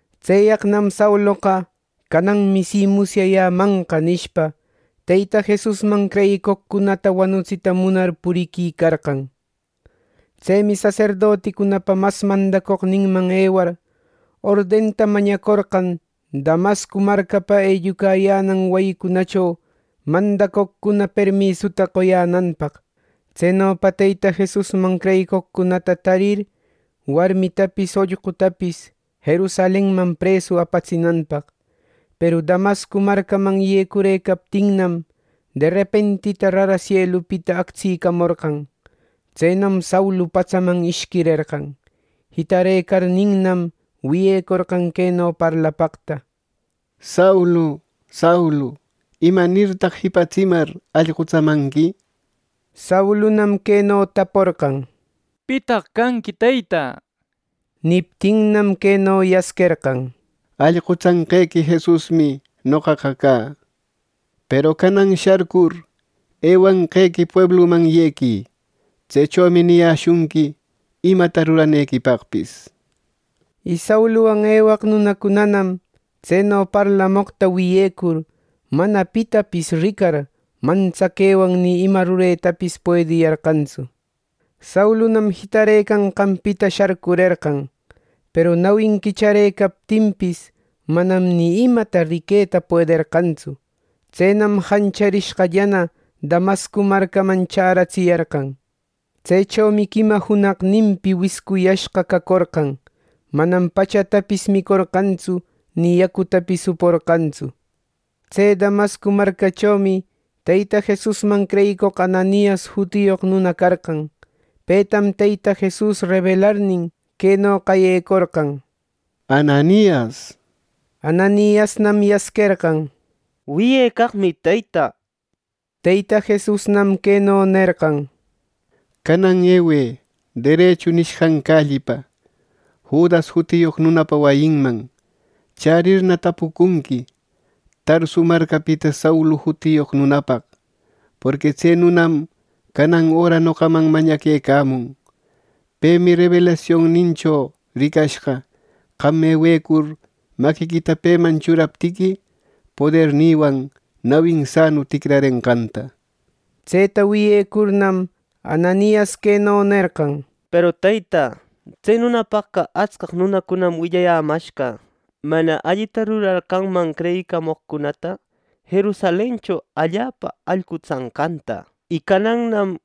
Tseyaqnam Sauloqa, “cananmi siqa musyayämanqa” nishpa, Teyta Jesusman creyicoqcunata wanutsita munar puriquicarqa. Tsemi saserdoticunapa mas mandacoqninman ewar, ordenta mañacorqan Damasco marcapa ellucayänan wayicunacho mandacoqcuna permisuta qoyänanpaq. Tsenopa Teyta Jesusman creyicoqcunataqa tarir, warmitapis ollqutapis Jerusalenman presu apatsinanpaq. Peru Damasco marcaman yecurëcaptinnam, derepentita rara sielupita actsicamorqan. Tsenam Saulu patsaman ishquirerqan. Jitarëcarninnam, wiyecorqan queno parlapaqta: —Saulu, Saulu, ¿imanirtaq jipatsimar, allqutsamanqui? Saulunam queno taporqan: —¿Pitaq canqui, Teyta? —nishpa. Niptinnam, queno yasquerqan: —Allqutsanqequi Jesusmi noqaqa cä. Peru canan sharcur ewecanqequi puebluman yequï. Tsechomi niyäshunqui imata ruranequipaqpis —nishpa. Y Sauluwan ewaq nunacunanam tseno parlamoqta wiyecur, mana pitapis ricar, mantsaquewan ni ima rureta puediyarqantsu. Saulunam jitarëcanqanpita sharcurerqan; peru nawin quicharëcaptinpis, manam ni imata riqueta puederqantsu. Tsenam jancharishqallana Damasco marcaman chäratsiyarqan. Tsechomi quima junaqninpi wiscuyashqa cacorqan. Manam pachatapis micorqantsu; ni yacutapis uporqantsu. Tse Damasco marcachomi Teyta Jesusman creyicoq Ananias jutiyoq nuna carqan. Petam Teyta Jesus rebelarnin, queno qayecorqan: —¡Ananias! —nishpa. Ananiasnam yasquerqan: —Wiyecaqmi, Teyta —nishpa. Teyta Jesusnam queno nerqan: —Canan ewë Derechu nishqan callipa, Judas jutiyoq nunapa wayinman. Chärirna tapucunqui Tarsu marcapita Saulu jutiyoq nunapaq; porqui tse nunam canan öra noqaman mañaquecamun. Pemi rebelasionnincho ricashqa, qam ewecur maquiquita peman churaptiqui, podernïwan nawin sanu ticrarenqanta —nir. Tseta wiyecurnam, Ananias queno nerqan: —Peru Teyta, tse nunapaqqa atscaq nunacunam willayämashqa, mana allita rurar qamman creyicamoqcunata Jerusalencho allapa allqutsanqanta. ¡Y canannam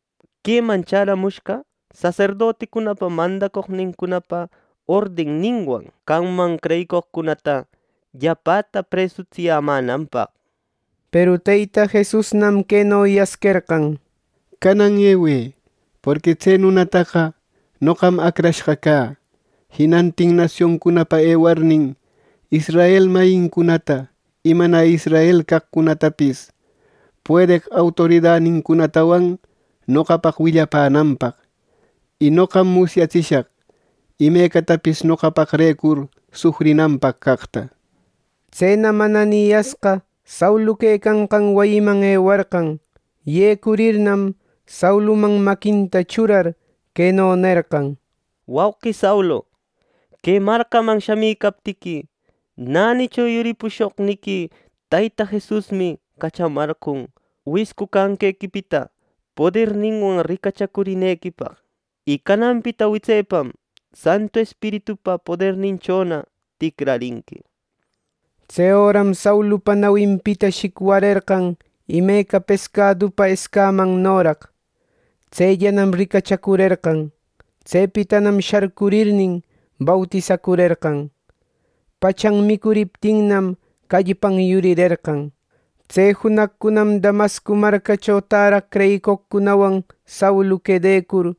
queman chäramushqa saserdoticunapa mandacoqnincunapa ordenninwan qamman creyicoqcunata llapäta presutsiyämänanpaq! Peru Teyta Jesusnam queno yasquerqan: —Canan ewë, porqui tse nunataqa noqam acrashqa cä. Jinantin nasioncunapa ewarnin, israel mayincunata y mana israel caqcunatapis puedeq autoridanincunatawan noqapaq willapänanpaq. Y noqam musyatsishaq imecatapis noqapaqrecur sufrinanpaq caqta. Tsenam Ananiasqa Saulu quecanqan wayiman ewarqan. Yecurirnam, Sauluman maquinta churar, queno nerqan: —Wauqi Saulu, que marcaman shamïcaptiqui, nänicho yuripushoqniqui Teyta Jesusmi cachamarqon wiscu canqequipita poderninwan ricachacurinequipaq. Y cananpita witsepam Santu Espiritupa poderninchona ticrarinqui. Tse öram Saulupa nawinpita shicwarerqan imeca pescadupa escamannoraq; tsellanam ricachacurerqan. Tsepitanam sharcurirnin, bautisacurerqan. Pachan micuriptinnam, callpan yurirerqan. Tse junaqcunam Damasco marcacho täraq creyicoqcunawan Saulu quedecur,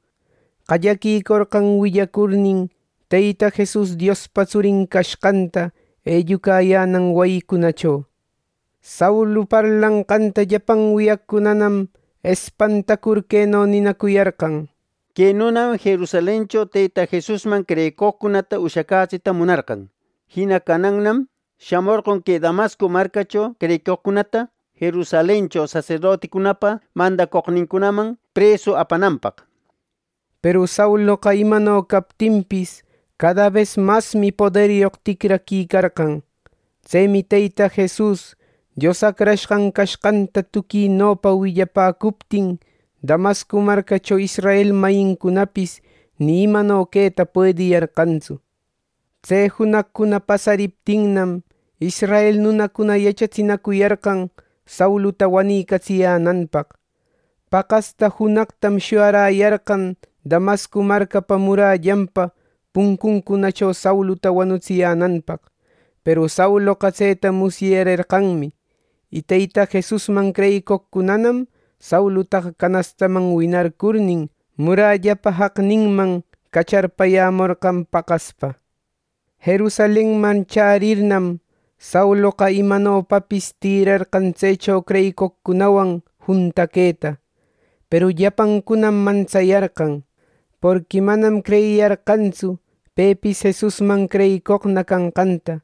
qallaquicorqan willacurnin Teyta Jesus Diospa tsurin cashqanta ellucayänan wayicunacho. Saulu parlanqanta llapan wiyaqcunanam espantacur, queno ninacuyarqan: —¡Que nunam Jerusalencho Teyta Jesusman creyicoqcunata ushacätsita munarqan! ¡Jina canannam shamorqon que Damasco marcacho creyicoqcunatana Jerusalencho saserdoticunapa mandacoqnincunaman presu apananpaq! —nir. Peru Sauloqa imano captinpis cada bes masmi poderyoq ticraquicarqan. Tsemi Teyta Jesus Dios Acrashqan cashqanta tuquinopa willapäcuptin, Damasco marcacho israel mayincunapis ni imano queta puediyarqantsu. Tse junaqcuna pasariptinnam, israel nunacuna yachatsinacuyarqan Sauluta wanicatsiyänanpaq. Paqasta junaqtam shuyaräyarqan Damasco marcapa murallanpa puncuncunacho Sauluta wanutsiyänanpaq; peru Sauloqa tseta musyarerqanmi. Y Teyta Jesusman creyicoqcunanam Saulutaqa canastaman winarcurnin, murallapa jaqninman cacharpayämorqan paqaspa. Jerusalenman chärirnam, Sauloqa imanopapis tïrarqan tsecho creyicoqcunawan juntaquëta. Peru llapancunam mantsayarqan, porqui manam creyiyarqantsu pepis Jesusman creyicoqna canqanta.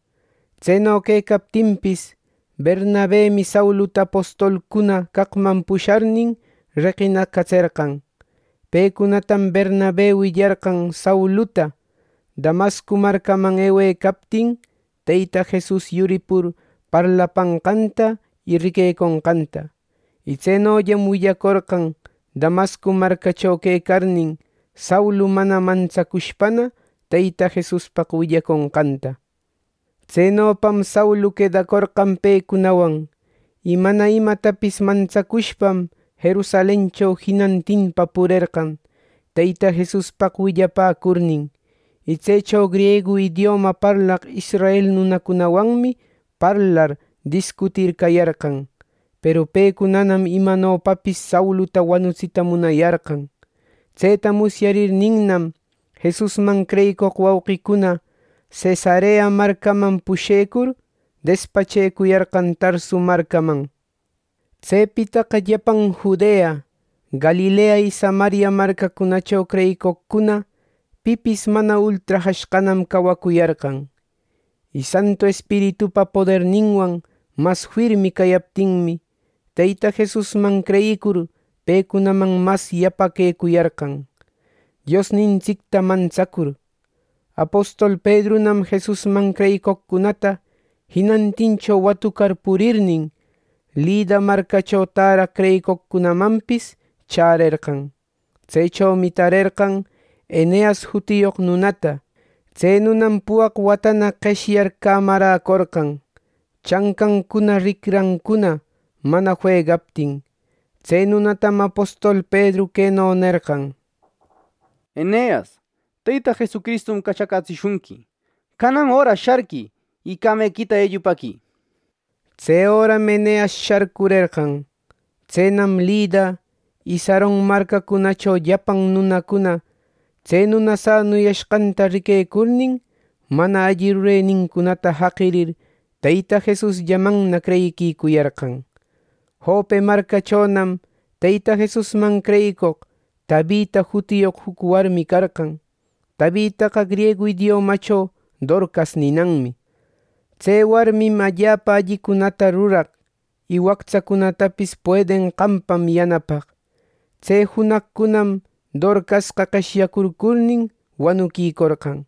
Tseno quecaptinpis, Bernabemi Sauluta apostolcuna caqman pusharnin reqinacatserqan. Pecunatam Bernabe willarqan Sauluta, Damasco marcaman ewecaptin, Teyta Jesus yuripur parlapanqanta y riqueconqanta. Y tsenollam willacorqan Damasco marcacho quecarnin, Saulu mana mantsacushpana Teyta Jesuspaq willaconqanta. Tsenopam Saulu quedacorqan pecunawan. Y mana imatapis mantsacushpam Jerusalencho jinantinpa purerqan, Teyta Jesuspaq willapäcurnin. Y tsecho griegu idioma parlaq israel nunacunawanmi parlar discutir cayarqan. Peru pecunanam imanopapis Sauluta wanutsita munayarqan. Tseta musyarirninnam, Jesusman creyicoq wauqicuna Cesarea marcaman pushecur, despachecuyarqan Tarsu marcaman. Tsepitaqa llapan Judea, Galilea y Samaria marcacunacho creyicoqcuna pipis mana ultrajashqanam cawacuyarqan. Y Santu Espiritupa poderninwan mas firmi cayaptinmi, Teyta Jesusman creyicur pecunaman mas yapaquecuyarqan, Diosnintsicta mantsacur. Apostol Pedrunam Jesusman creyicoqcunata jinantincho watucar purirnin, Lida marcacho täraq creyicoqcunamanpis chärerqan. Tsechomi tarerqan Eneas jutiyoq nunata. Tse nunam puwaq watana qeshyar camaräcorqan, chancancuna ricrancuna mana fuegaptin. Tse nunatam apostol Pedru queno nerqan: —Eneas, Teyta Jesucristum cachacätsishunqui. Canan öra sharquï y camequita ellupäquï —nishpa. Tse öram Eneas sharcurerqan. Tsenam Lida y Saron marcacunacho llapan nunacuna tse nuna sanuyashqata riquecurnin, mana alli rurenincunata jaqirir, Teyta Jesusllamanna creyiquicuyarqan. Jope marcachonam Teyta Jesusman creyicoq Tabita jutiyoq juc warmi carqan. Tabitaqa griegu idiomacho Dorcas ninanmi. Tse warmim allapa allicunata ruraq, y wactsacunatapis puedenqanpam yanapaq. Tse junaqcunanam Dorcasqa qeshyacurcurnin wanuquicorqan.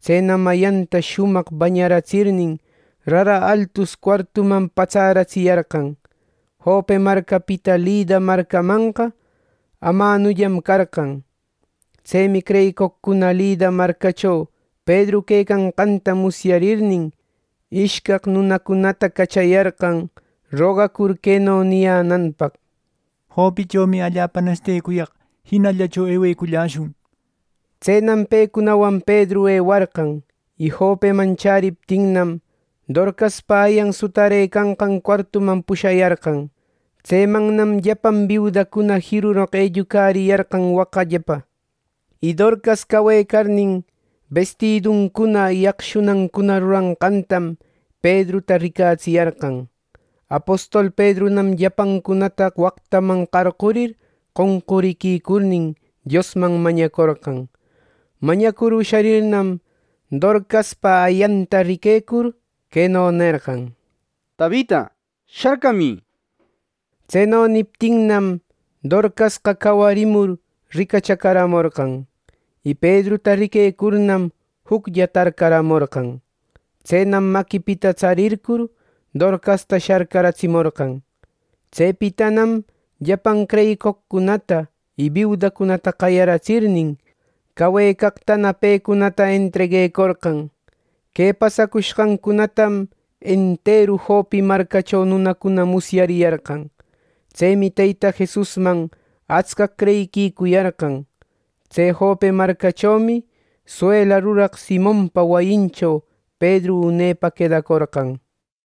Tsenam ayanta shumaq bañaratsirnin, rara altus cuartuman patsäratsiyarqan. Jope marcapita Lida marcamanqa amanullam carqan. Tsemi creyicoqcuna Lida marcacho Pedru quecanqanta musyarirnin, ishcaq nunacunata cachayarqan, rogacur queno niyänanpaq: —Jopechomi allapa nesitecuyaq. Jinallacho eweculläshun —nishpa. Tsenam pecunawan Pedru ewarqan. Y Jopeman chäriptinnam, Dorcaspa ayan sutarëcanqan cuartuman pushayarqan. Tsemannam llapan biudacuna jiruroq ellucariyarqan waqallapa. Y Dorcas cawecarnin, bestiduncuna y aqshunancuna ruranqantam Pedruta ricatsiyarqan. Apostol Pedrunam llapancunata waqtaman qarqurir qonqurïcurnin, Diosman mañacorqan. Mañacur usharirnam, Dorcaspa ayanta riquecur, queno nerqan: —¡Tabita, sharcamï! —nishpa. Tseno niptinnam, Dorcasqa cawarimur ricachacaramorqan. Y Pedruta riquecurnam, juclla tarcaramorqan. Tsenam maquipita tsarircur, Dorcasta sharcaratsimorqan. Tsepitanam llapan creyicoqcunata y biudacunata qayaratsirnin, cawecaqtana pecunata entreguecorqan. Que pasacushqancunatam enteru Jope marcacho nunacuna musyariyarqan. Tsemi Teyta Jesusman atscaq creyiquicuyarqan. Tse Jope marcachomi suela ruraq Simonpa wayincho Pedru unepa quedacorqan.